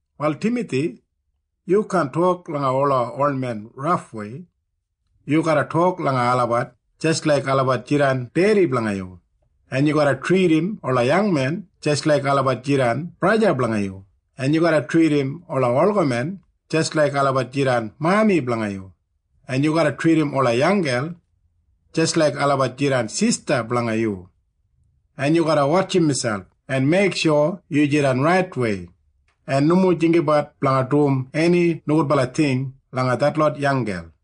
Wal Timathi, yu kaan tok langa ola olmen rafwei. Yu garra tok langa olabat jis laik olabat jidan dedi blanga yu, en yu garra tridim ola yangmen jis laik olabat jidan braja blanga yu, en yu garra tridim ola olgamen jis laik olabat jidan mami blanga yu, en yu garra tridim ola yanggel jis laik olabat jidan sista blanga yu. En yu garra wotjim miselp en meiksho yu jidan raitwei en nomo jinggabat blanga dum eni nogudbala ting langa detlot yanggel.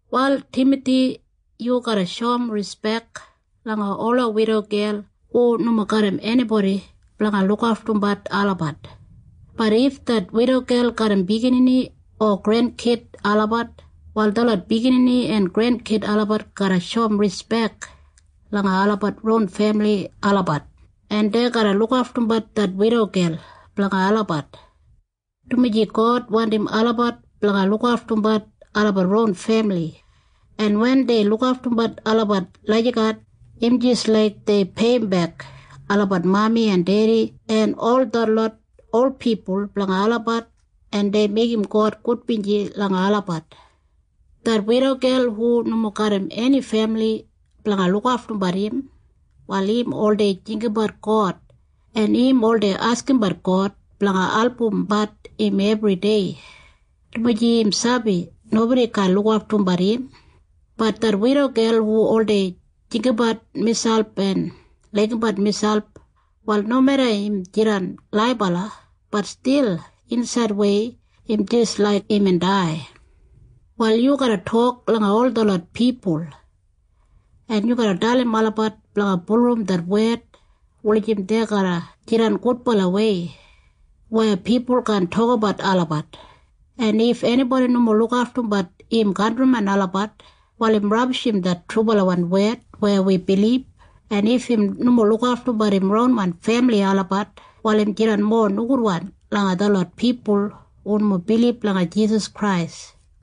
Wal Timathi, yu garra shoum rispek langa ola widogel hu nomo garram enibodi blanga lukaftumbat olabat. Bat if det widogel garram biginini o grenkid olabat, wal detlot biginini en grenkid olabat garra shoum rispek langa olabat ron femili olabat, en dei garra lukaftumbat det widogel blanga olabat, dumaji God wandim olabat blanga lukaftumbat olabat ron femili. En wen dei lukaftumbat olabat lagijat, im jis laik dei peiyimbek olabat mami en dedi en ol detlot ol pipul blanga olabat, en dei meigim God gudbinji langa olabat. Det widogel hu nomo garram eni femili blanga lukaftumbat im, wal im oldei jinggabat God, en im oldei askimbat God blanga albumbat im ebridei, dumaji im sabi nobodi kaan lukaftumbat im. Bat det widogel hu oldei jinggabat imselp en laigimbat miselp, wal nomeda im jidan laibala, bat stil insaidwei im jis laik imbin dai. Wal yu garra tok langa ol detlot pipul, en yu garra dalim olabat blanga bulurrum det wed wulijim dei garra jidan gudbalawei weya pipul kaan tokabat olabat. En if enibodi nomo lukaftumbat im kantrimen olabat, wal im rabishim det trubalawan wed weya wi bilib. En if im nomo lukaftumbat im ronwan femili olabat, wal im jidan mowa nogudwan langa detlot pipul hu nomo bilib langa Jisas Krais.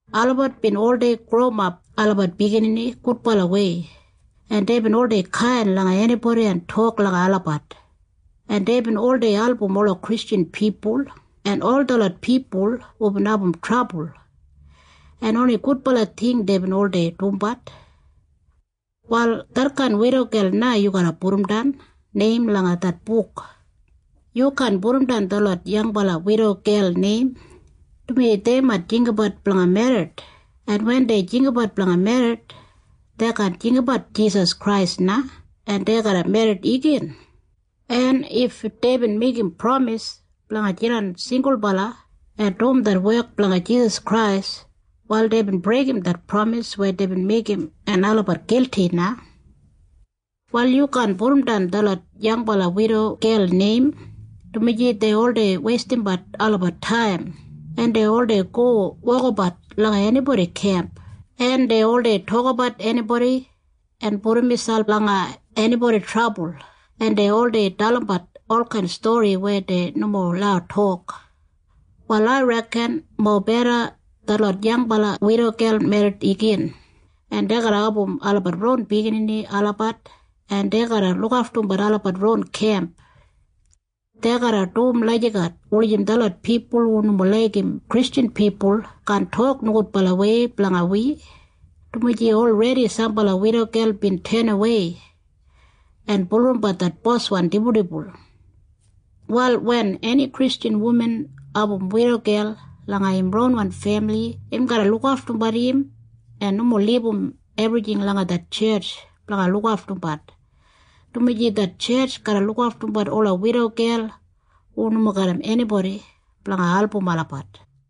Olabat bin oldei growimap olabat biginini gudbalawei, en deibin oldei kain langa enibodi en tok langa olabat, en deibin oldei album ola Kristjan pipul en ol detlot pipul hubin abum trabul, en oni gudbala ting deibin oldei dumbat. Wal detkain widogel na yu garra pudumdan neim langa det buk. Yu kaan pudumdan detlot yangbala widogel neim, dumaji dei mait jinggabat blanga merrit, en wen dei jinggabat blanga merrit, dei kaan jinggabat Jisas Krais na, en dei garra merrit igin. En if deibin meigim pramis blanga jidan singulbala en dum det wek blanga Jisas Krais, wal deibin breigim det pramis weya deibin meigim, en olabat gilti na. Wal yu kaan pudumdan detlot yangbala widogel neim, dumaji dei oldei weistimbat olabat taim, en dei oldei go wokabat langa enibodi kemp, en dei oldei tokabat enibodi en pudum miselp langa enibodi trabul, en dei oldei dalimbat olkain stori weya dei nomo lau tok. Wal ai reken mobeda detlot yangbala widogel merrit igin, en dei garra abum olabat ron biginini olabat, en dei garra lukaftumbat olabat ron kemp. Dei garra dum lagijat wulijim detlot pipul hu nomo laigim Kristjan pipul kaan tok nogudbalawei blanga wi, dumaji olredi sambala widogel bin tenawei en bulurrumbat det boswan dibuldibul. Wal wen eni Kristjan wuman abum widogel langa im ronwan femili, im garra lukaftumbat im en nomo libum ebrijing langa det tjetj blanga lukaftumbat, dumaji det tjetj garra lukaftumbat ola widogel hu nomo garram enibodi blanga album olabat.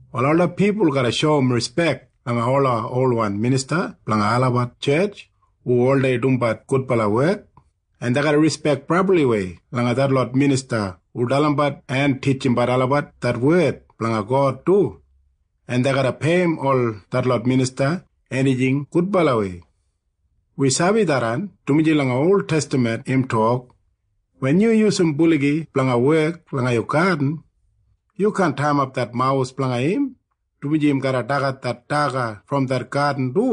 Wal ola pipul garra shoum rispek langa ola olwan minista blanga olabat tjetj hu oldei dumbat gudbala wek. En dei garra rispek brabliwei langa detlot minista hu dalimbat en titjimbat olabat det wed blanga God du. En dei garra peiyim ol detlot minista enijing gudbalawei. Wi sabi tharran, dumaji langa oltestaman im tok, “Wen yu yusum buligi blanga wek langa yu gadin, yu kaan taiyimap det mawus blanga im, dumaji im garra dagat det daga brom det gadin du.”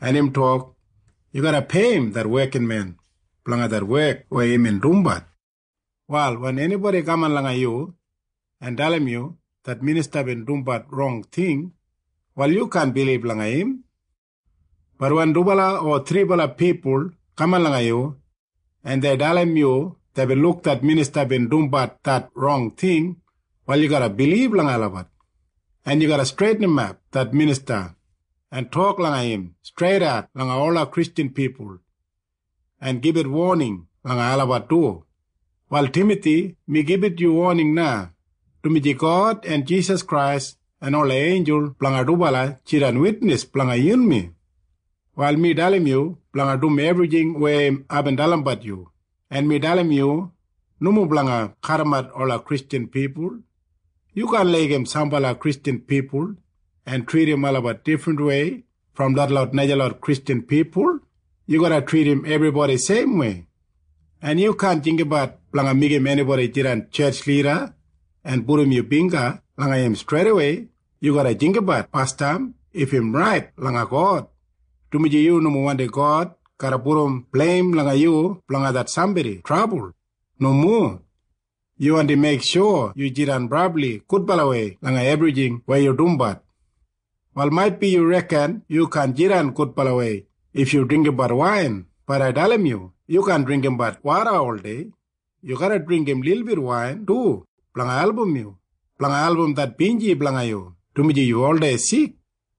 En Jisas bin tok, “Yu garra peiyim det wekinmen blanga det wek weya im dumbat.” Wal wen enibodi kaman langa yu en dalim yu det minista bin dumbat rong ting, wal yu kaan bilib langa im. Bat wen dubala o thribala pipul kaman langa yu, en dei dalim yu deibin luk det minista bin dumbat det rong ting, wal yu garra bilib langa olabat, en yu garra streitinimap det minista en tok langa im streitat langa ola Kristjan pipul en gibit woning langa olabat du. Wal Timathi, mi gibit yu woning na, dumaji God en Jisas Krais en ola einjul blanga dubala jidan witnis blanga yunmi. Wal mi dalim yu blanga dum ebrijing weya aibin dalimbat yu, en mi dalim yu nomo blanga kadimat ola Kristjan pipul. Yu kaan laigim sambala Kristjan pipul en tridim olabat difrinwei brom detlot najalot Kristjan pipul. Yu garra tridim ebribodi seimwei. En yu kaan jinggabat blanga meigim enibodi jidan tjetj lida en pudum yu bingga langa im streidawei. Yu garra jinggabat basdam if im rait langa God, dumaji yu nomo wandi God garra pudum bleim langa yu blanga det sambodi trabul. Nomo. Yu wandi meiksho yu jidan brabli gudbalawei langa ebrijing weya yu dumbat. Wal maitbi yu reken yu kaan jidan gudbalawei if yu dringgimbat wain. Bat ai dalim yu. Yu kaan dringgimbat woda oldei. Yu garra dringgim lilbit wain du blanga album det binji blanga yu, dumaji yu oldei sik.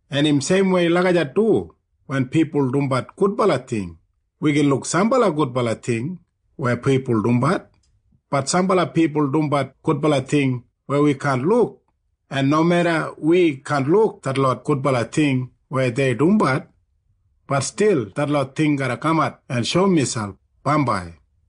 En im seimwei lagijat du wen pipul dumbat gudbala ting. Wi gin luk sambala gudbala ting weya pipul dumbat. Bat sambala pipul dumbat gudbala ting weya wi kaan luk. En nomeda wi kaan luk detlot gudbala ting weya dei dumbat, bat stil detlot ting garra kamat en shoum miselp bambai.